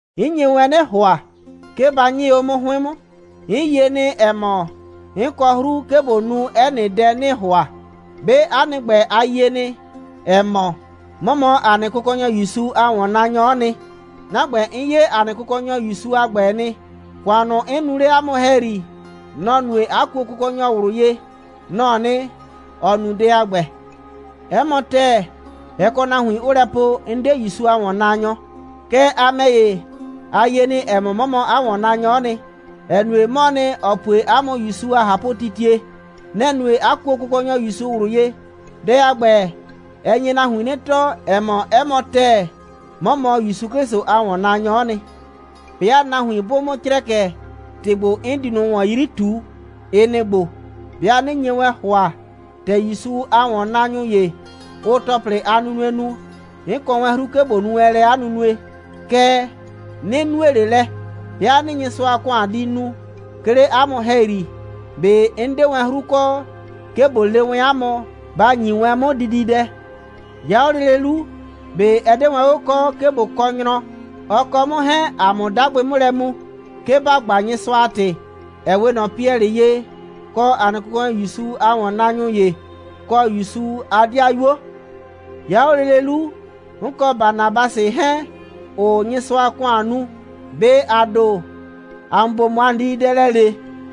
'N nye wɛn 'nɩ ‑hʋa, 'ke ba 'nyɩɩ 'o 'mʋ 'hʋɩn 'mʋ. 'N yie nɩ, ‑ɛ mɔ, 'n kɔ 'hru, 'ke ꞊bo nu 'ɛ nɩ dɛ, 'nɩɩ ‑hʋa. 'Be 'a nɩ ‑gbɛ, a yie nɩ, ‑ɛ mɔ, 'mɔ mɔ ‑a nɩ Kʋkɔnyɔ ‑Yusu a ‑wɔnnaanyɔ'ɔ nɩ. 'Na ‑gbɛ, 'n 'ye ‑a nɩ Kʋkɔnyɔ ‑Yusu a ‑gbɛ nɩ. ‑Kʋan ꞊nʋ, 'n nu 'le 'a mʋ ‑hɛyri, nɔ‑ nue, 'a kuo Kʋkɔnyɔ ꞊wlʋ ye. Nɔ‑ɔ nɩ, ‑ɔ nu dɛ a ‑gbɛ. 'Ɛ mɔ ‑tɛɛ, ɛ kɔ nahuin, 'ʋʋ lɛ po, 'n 'de ‑Yusu a ‑wɔnnaanyɔ. Kɛɛ, a ‑mɛ ‑ye, a yie nɩ, ‑ɛ mɔ, 'mɔ mɔ 'a ‑wɔnnaanyɔ'ɔ nɩ, ‑ɛ nue, 'mɔɔ nɩ, ‑ɔ pue 'a mʋ ‑Yusu a ꞊hapʋtitie. Nɛ‑ nue, 'a kuo Kʋkɔnyɔ ‑Yusu ꞊wlʋ ye. Dɛ a ‑gbɛ, ɛ nye nahuin 'nɩ tɔɔ, ‑ɛ mɔ, 'ɛ mɔ ‑tɛɛ, 'mɔ mɔ ‑Yusu 'Klɩsʋ a ‑wɔnnaanyɔ'ɔ nɩ. 'Bɩa nahuin 'bʋʋ 'mʋ crɛkɛ, ‑tɩ ‑gbo, 'n di ꞊nʋ ꞊wɔn 'yri ꞊tuu, ɩ nɩ‑ ‑gbo: 'Bɩa 'nɩ nye wɛn ‑hʋa, ‑tɛ ‑Yusu a ‑wɔnnaanyʋ ‑ye, ʋʋ ‑tɔplɩ a nunue nu, 'n kɔ wɛn 'hru, 'ke ꞊bo nu wɛn lɛ 'a nunue, kɛɛ, 'nɩ nue ꞊le lɛ. 'Bɩa 'nɩɩ Nyɩsʋa a ‑kʋan di nu, 'ke 'le 'a mʋ ‑hɛyri, ꞊be 'n 'de wɛn 'hru kɔ, 'ke ꞊bo le wɛn 'a mʋ, ba ‑nyi wɛn 'mʋ dididɛ. 'Ya 'o lele 'lu, ꞊be ɛ 'de wɛn 'o kɔ, 'ke ꞊bo kɔ nyrɔ, ɔ kɔ 'mʋ 'hɛɛn, ‑a 'mʋ 'dagbɩ 'mʋ lɛ mu, 'ke ‑ba gba Nyɩsʋa a ‑tɩ, ‑ɛ 'we ꞊nɔ Piɛlɩ ye, kɔ ‑a nɩ Kʋkɔnyɔ ‑Yusu a ‑wɔnnaanyʋ ‑ye, kɔ ‑Yusu a 'dɩayuo? 'Ya 'o lele 'lu, 'n kɔ Banabasɩ 'hɛɛn, ‑ʋʋ Nyɩsʋa a ‑kʋan nu, ꞊be ‑a ‑do, ‑a mʋ ‑bo ꞊mɔ ‑a nɩ dididɛ lɛ ‑le?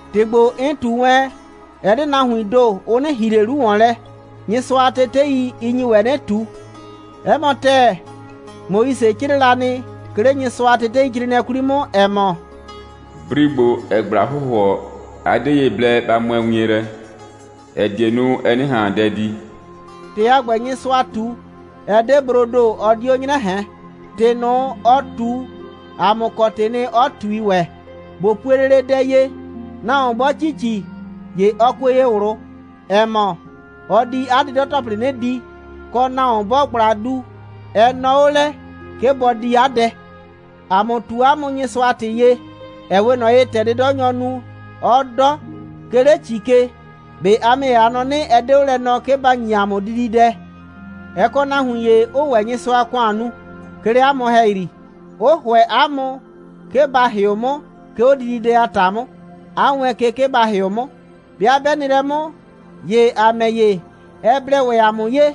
‑Tɩ ‑gbo, 'n ꞊tu wɛn, ɛ 'de nahuiin ‑do, ʋ 'nɩ ‑hi ꞊le 'lu ‑wɔn lɛ. Nyɩsʋa a tetei, ɩ nyi ‑wɛ 'nɩ ꞊tu. 'Ɛ mɔ ‑tɛɛ, Moise 'crɩɛ la nɩ, 'ke 'le Nyɩsʋa a teteicrɩɩnɩɛ 'kwli 'mʋ, ‑ɛ mɔ: «Bri ‑gbo, ‑ɛɛ ꞊gbla hʋhʋɔ, a 'de ye blɛ ba mʋɛ wien lɛ, ‑ɛ die nu, ɛ 'nɩ ꞊han dɛ di.» ‑Tɩ a ‑gbɛ, Nyɩsʋa ꞊tu, ɛ 'de broo ‑do, ɔ 'dio 'nyrɛ ꞊hɛn. ‑Tɩ ꞊nʋ, ɔ ꞊tu, ‑a mʋ kɔ ‑tɩɩ nɩ, 'ɔ ꞊tui ‑wɛ. ꞊Bo pue lele dɛ ye. Nahuon 'bɔɔ ‑ci ‑ci, ‑ye ɔ kue ye ꞊wlʋ, ‑ɛ mɔ, ɔ di 'a 'dɩdɔ‑tɔplɩ 'nɩ di, kɔ, nahuon 'bɔɔ ꞊gbla du, ɛ nɔɔ 'o lɛ, 'ke bɔ di 'a dɛ. ‑A mʋ ꞊tu 'a mʋ Nyɩsʋa a ‑tɩ ye, ‑ɛ 'we ꞊nɔ ye, ‑tɛ 'dɩdɔnyɔɔ nu, 'ɔɔ 'dɔ, 'ke 'le ‑ci ke. ꞊Be a ‑mɛ ‑ye, a nɔ 'nɩ, ɛ 'de 'o lɛ nɔɔ, 'ke ba ‑nyi ‑a mʋ dididɛ? Ɛ kɔ nahuin ‑ye, 'ʋʋ ‑wɛ Nyɩsʋa a ‑kʋan nu, 'ke 'le 'a mʋ ‑hɛyri, 'ʋ ‑hʋɛ 'a mʋ, 'ke ba ‑hɩʋ 'mʋ, 'ke 'o dididɛ a ‑ta 'mʋ, 'a wɛɛn ke, 'ke ba ‑hɩʋ 'mʋ. 'Bɩa 'bɛ nɩ lɛ 'mʋ, ‑ye ‑a ‑mɛ ‑ye, ɛ blɛ ‑wɛ ‑a mʋ ye,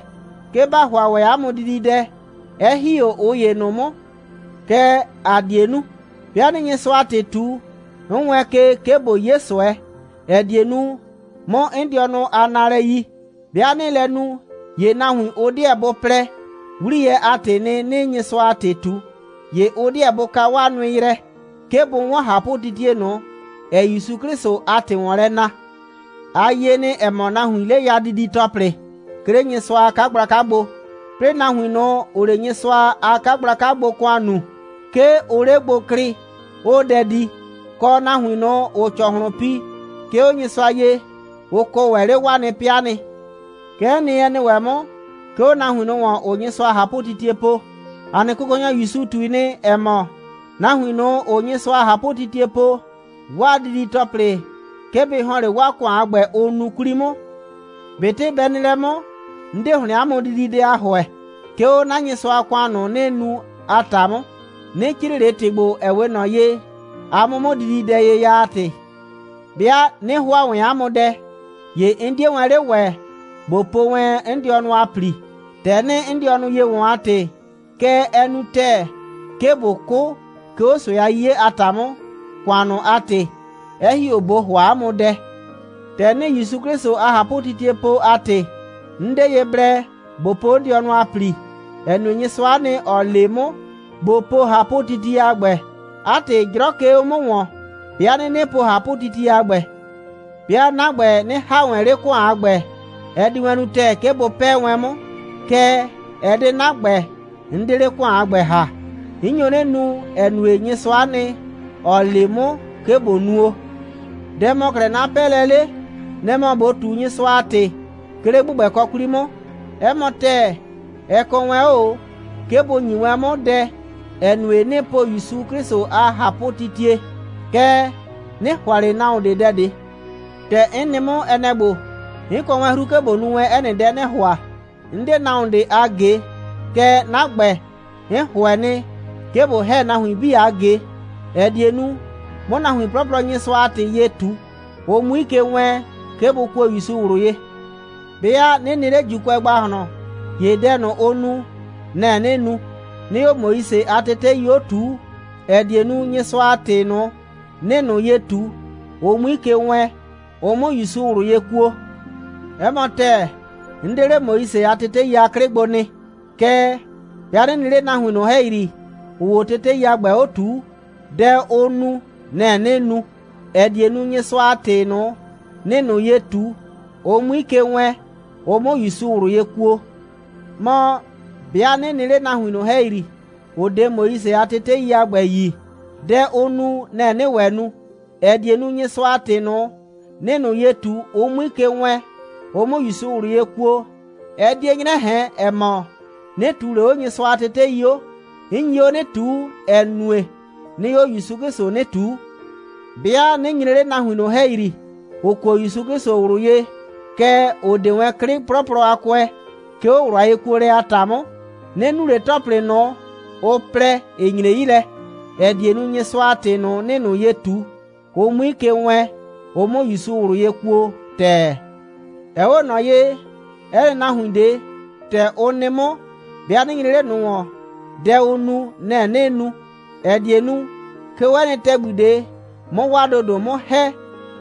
'ke ‑ba ‑hʋa ‑wɛ 'a mʋ dididɛ, 'ɛ ‑hi 'o ꞊ʋ ‑ye ꞊nʋ 'mʋ. Kɛɛ, ‑a 'die nu. 'Bɩa 'nɩɩ Nyɩsʋa a ‑tɩ ꞊tu, 'n wɛɛn ke, 'ke ꞊bo 'ye ꞊sʋɛ, ‑ɛ die nu, 'mʋ 'n dɩɔnʋ a naalɛ yi. 'Bɩa 'nɩɩ lɛ nu, ‑ye nahuin, ʋ 'deɛ bʋ plɛ, 'wliyɛ a ‑tɩɩ nɩ, 'nɩɩ Nyɩsʋa a ‑tɩ ꞊tu, ‑ye ʋ 'deɛ bʋ ka 'waa nʋɩ yrɛ, 'ke bʋ 'wɔn ꞊hapʋtitie ꞊nʋ, ‑ɛɛ ‑Yusu 'Klɩsʋ a ‑tɩ ‑wɔn lɛ na. A yie nɩ, ‑ɛ mɔ, nahuiin 'le ya didi‑tɔplɩ, 'ke 'le Nyɩsʋa a 'kagblaka gbo, 'plɩɩ nahuin ꞊nʋ, ‑ʋʋ 'le Nyɩsʋa a 'kagblaka gbo ‑kʋan nuu, 'ke ʋʋ 'le gbo klɩɩ, 'ʋʋ dɛ di, kɔ, nahuin ꞊nʋ, ‑ʋʋ ‑cɔhlʋn pi, 'ke 'o Nyɩsʋa ye, ʋ kɔ ‑wɛ 'le 'waa nɩ 'pɩa nɩ. Kɛ'ɛ nɩ, ɛ nɩ ‑wɛ 'mʋ, 'ke 'o nahuin ꞊nʋ, ‑ʋʋ Nyɩsʋa a ꞊hapʋtitie po. ‑A nɩ Kʋkɔnyɔ ‑Yusu ꞊tui nɩ, ‑ɛ mɔ, nahuin ꞊nʋ, ‑ʋʋ Nyɩsʋa a ꞊hapʋtitie po, 'waa didi‑tɔplɩ, 'ke bɩ ‑hɔn 'le 'waa ‑kʋan a ‑gbɛ, ʋʋ nu 'kwli 'mʋ. ꞊Betɩ bɛ nɩ lɛ 'mʋ, 'n 'de ‑hlɩn 'a mʋ dididɛ a ‑hʋɛ, 'ke 'o 'na Nyɩsʋa a ‑kʋan ꞊nʋ, 'nɩɩ nu a ‑ta 'mʋ. 'Nɩ 'crɩɩ ꞊le ‑tɩ ‑gbo, ‑ɛ 'we ꞊nɔ ye, a 'mʋ 'mʋ dididɛ ye ya a ‑tɩ. 'Bɩa 'nɩ ‑hʋa wɛn 'a mʋ dɛ, ‑ye 'n 'die wɛn 'le ‑wɛ, ꞊bo po wɛn 'n dɩɔnʋ a ‑pli, ‑tɛ 'nɩɩ 'n dɩɔnʋ ye ‑wɔn a ‑tɩ. Kɛɛ, ɛ nu wɛn ‑tɛɛ, 'ke ꞊bo 'kʋ, 'ke 'o ꞊sʋɛ a 'yiye a ‑ta 'mʋ, kanʋ a ‑tɩ, 'ɛ ‑hi 'o ꞊bo ‑hʋa 'a mʋ dɛ. ‑Tɛ 'nɩɩ ‑Yusu 'Klɩsʋ a ꞊hapʋtitie po a ‑tɩ, 'n 'de ye blɛ ꞊bo po 'n dɩɔnʋ a ‑pli, ‑ɛ nue, Nyɩsʋa'a nɩ, ‑ɔ le 'mʋ, ꞊bo po ꞊hapʋtitie a ‑gbɛ. 'A ‑tɩ, 'jrɔ 'ke 'o 'mʋ ‑wɔn, 'bɩa 'nɩnɩ po ꞊hapʋtitie a ‑gbɛ. 'Bɩa 'na ‑gbɛ 'nɩ ‑ha wɛn 'le ‑kʋan a ‑gbɛ, ɛ di wɛn nu ‑tɛɛ, 'ke bʋ 'pɛɛ wɛn 'mʋ, kɛɛ, ɛ 'de 'na ‑gbɛ, 'n 'de 'le ‑kʋan a ‑gbɛ ‑ha. 'N nyo 'nɩ nu, ‑ɛ nue, Nyɩsʋa'a nɩ, ‑ɔ le 'mʋ, 'ke ꞊bo nuo. Dɛ‑ mɔ 'klɛɛ 'na 'pɛɛlɛ 'le? Nɛ‑ mɔ ꞊bo ꞊tu Nyɩsʋa a ‑tɩ, 'ke 'le ‑gbʋgbɛkɔ 'kwli 'mʋ. 'Ɛ mɔ ‑tɛɛ, ɛ kɔ wɛn 'o ꞊o, 'ke bʋ ‑nyi wɛn 'mʋ dɛ, ‑ɛ nue, 'nɩɩ po ‑Yusu 'Klɩsʋ a ꞊hapʋtitie. Kɛɛ, 'nɩ ‑hʋa ꞊le nahuon ꞊de dɛ ꞊de. ‑Tɛ 'n nɩ 'mʋ, ɛ nɛ‑ ‑gbo: 'N kɔ wɛn 'hru, 'ke ꞊bo nu wɛn 'ɛ nɩ dɛ 'nɩɩ ‑hʋa. 'N 'de nahuon ꞊de a ꞊ge. Kɛɛ, 'na ‑gbɛ, 'n ‑hʋɛ nɩ, 'ke ꞊bo ‑hɛ nahuin 'bii a ꞊ge, ‑ɛ die nu, 'mʋ nahuin 'plɔplɔ Nyɩsʋa a ‑tɩ ye ꞊tu, ʋ 'mui ke wɛɛn, 'ke bʋ kuo ‑Yusu ꞊wlʋ ye. 'Bɩa 'nɩ nɩ 'le ‑Juukʋɛ ‑gbahlɔn, ‑ye dɛ ʋʋ nu, nɛ‑ 'nɩɩ nu, 'nɩɩ 'o Moise a tetei 'o ꞊tuu, ‑ɛ die nu, Nyɩsʋa a ‑tɩ ꞊nʋ, 'nɩɩ ꞊nʋ ye ꞊tu, ʋ 'mui ke wɛɛn, ʋ 'mʋ ‑Yusu ꞊wlʋ ye kuo. 'Ɛ mɔ ‑tɛɛ, 'n 'de 'le Moise a tetei a 'klɩ gbo nɩ. Kɛɛ, 'bɩa 'nɩ nɩ 'le nahuin ꞊nʋ ‑hɛyri, ‑ʋʋ 'o tetei a ‑gbɛ 'o ꞊tuu, dɛ ʋʋ nu, nɛ‑ 'nɩɩ nu, ‑ɛ die nu, Nyɩsʋa a ‑tɩ ꞊nʋ, 'nɩɩ ꞊nʋ ye ꞊tu, ʋ 'mui ke wɛɛn, ʋ 'mʋ ‑Yusu ꞊wlʋ ye kuo. Mɔ, 'bɩa 'nɩ nɩ 'le nahuin ꞊nʋ ‑hɛyri, ‑ʋ 'de Moise a tetei a ‑gbɛ yi, dɛ ʋʋ nu, nɛ‑ 'nɩɩ ‑wɛ nu, ‑ɛ die nu, Nyɩsʋa a ‑tɩ ꞊nʋ, 'nɩɩ ꞊nʋ ye ꞊tu, ʋ 'mui ke wɛɛn, ʋ 'mʋ ‑Yusu ꞊wlʋ ye kuo. Ɛ 'die 'nyrɛ ꞊hɛn, ‑ɛ mɔ, 'nɩ ꞊tuu ꞊le 'o Nyɩsʋa a tetei 'o. 'N nyi 'o 'nɩ ꞊tuu, ‑ɛ nue, 'nɩɩ 'o ‑Yusu 'Klɩsʋ 'nɩ ꞊tuu. 'Bɩa 'nɩ nyre 'le nahuin ꞊nʋ ‑hɛyri, ‑ʋ kuo ‑Yusu 'Klɩsʋ ꞊wlʋ ye, kɛɛ, ‑ʋ 'de wɛn 'klɩ 'plɔplɔ a kʋɛ, 'ke 'o ꞊wlʋ a yekuolɛ a ‑ta 'mʋ, 'nɩ nu ꞊le ‑tɔplɩ ꞊nʋ, ʋ plɛ, ‑ɩ nyre 'yi lɛ, ‑ɛ die nu, Nyɩsʋa a ‑tɩ ꞊nʋ, 'nɩɩ ꞊nʋ ye ꞊tu, ʋ 'mui ke wɛɛn, ʋ 'mʋ ‑Yusu ꞊wlʋ ye kuo ‑tɛɛ. Ɛ 'we ꞊nɔ ye, 'ɛ nɩ nahuin ꞊de, ‑tɛ ʋ nɩ 'mʋ, 'bɩa 'nɩ nyre 'le ꞊nʋ ‑wɔn, dɛ ʋʋ nu, nɛ‑ 'nɩɩ nu, ‑ɛ die nu, 'ke 'o 'ɛ nɩ ‑tɛgbi ꞊de, 'mʋ 'waa ‑dodo 'mʋ ‑hɛ,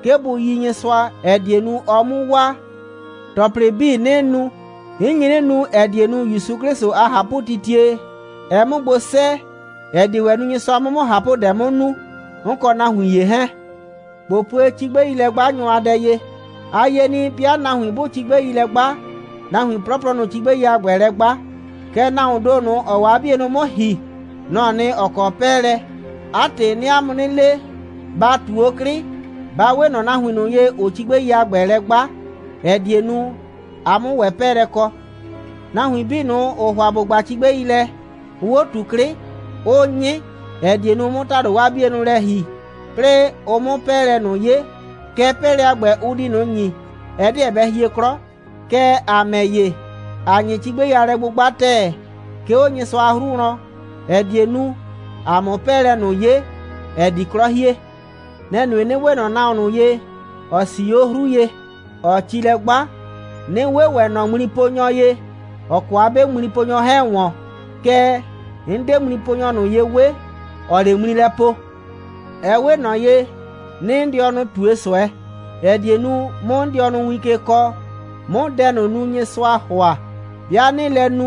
'ke bʋ yi Nyɩsʋa, ‑ɛ die nu, ɔ 'mu waa. ‑Tɔplɩ 'bii, 'nɩɩ nu, 'n nyi 'nɩ nu, ‑ɛ die nu, ‑Yusu 'Klɩsʋ a ꞊hapʋtitie, ɛ 'mʋ gbo 'sɛɛ, ‑ɛ die ‑wɛ nu, Nyɩsʋa 'mʋ 'mʋ ꞊hapʋdɛ 'mʋ nu, 'n kɔ nahuin ‑ye 'hɛɛn. ꞊Bo pue cigbɛilɛ'gbanyʋ a dɛ ye. A yie nɩ, 'bɩa nahuin 'bʋʋ cigbɛi lɛ 'gba, nahuin 'plɔplɔ, nʋ‑ʋ cigbɛi a ‑gbɛ lɛ 'gba, kɛɛ, nahuoon ‑do ꞊nʋ, ‑ɔɔ 'o 'a 'bienʋ 'bii 'mʋ ‑hi, nɔ‑ɔ nɩ, ‑ɔ kɔ 'pɛɛlɛ. 'A ‑tɩ, 'nɩɩ 'a mʋ 'nɩ le, ba ꞊tu 'o 'klɩ, ba 'we ꞊nɔ nahuin ꞊nʋ ye, ‑ʋʋ cigbɛi a ‑gbɛ lɛ 'gba, ‑ɛ die nu, a 'mʋ ‑wɛ 'pɛɛlɛ kɔ. Nahuin 'bii ꞊nʋ, ‑ʋʋ ‑hʋa ‑bʋ 'gba cigbɛi lɛ, ʋʋ 'o ꞊tu 'klɩ, 'ʋʋ 'nyɩ, ‑ɛ die nu, ʋ 'mʋ ‑tado 'waa 'bienʋ lɛ ‑hi, 'plɩɩ ʋ 'mʋ 'pɛɛlɛ ꞊nʋ 'ye. Kɛɛ, 'pɛɛlɛ a ‑gbɛ, ʋ di ꞊nʋ ‑nyi, ɛ 'deɛ bɛ hie 'klɔ. Kɛɛ, ‑a ‑mɛ ‑ye, ‑aa 'nyɩ cigbɛi a lɛ'gbʋgba ‑tɛɛ, 'ke 'o Nyɩsʋa a 'hru wlɔn, ‑ɛ die nu, ‑a 'mʋ 'pɛɛlɛ ꞊nʋ 'ye, ‑ɛ di 'klɔ hie. Nɛ‑ nue, 'nɩ 'we ꞊nɔ nahuon ꞊nʋ ye, ‑ɔ 'sii 'o 'hru ye, ‑ɔɔ ci lɛ 'gba, 'nɩ 'we ‑wɛ ꞊nɔ ŋmliponyɔ ye, ‑ɔ kɔ 'a 'be ŋmliponyɔ 'hɛɛn ‑wɔn. Kɛɛ, 'n 'de ŋmliponyɔ ꞊nʋ ye 'we, ‑ɔɔ 'le ŋmli lɛ po. Ɛ 'we ꞊nɔ ye, 'nɩɩ 'n dɩɔnʋ ꞊tue ꞊sʋɛ, ‑ɛ die nu, 'mʋ 'n dɩɔnʋ win ke kɔɔ, 'mʋ dɛ ꞊nʋ nu, Nyɩsʋaa ‑hʋa. 'Bɩa 'nɩɩ lɛ nu,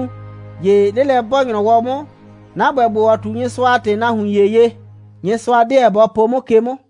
‑ye 'lelɛ'bɔɔ‑nyrɔwɔ 'mʋ, 'na ‑gbɛ ‑gbo, ‑ɔ ꞊tu Nyɩsʋa a ‑tɩ nahuin ‑ye ye, Nyɩsʋa 'deɛ bɔ po 'mʋ ke 'mʋ.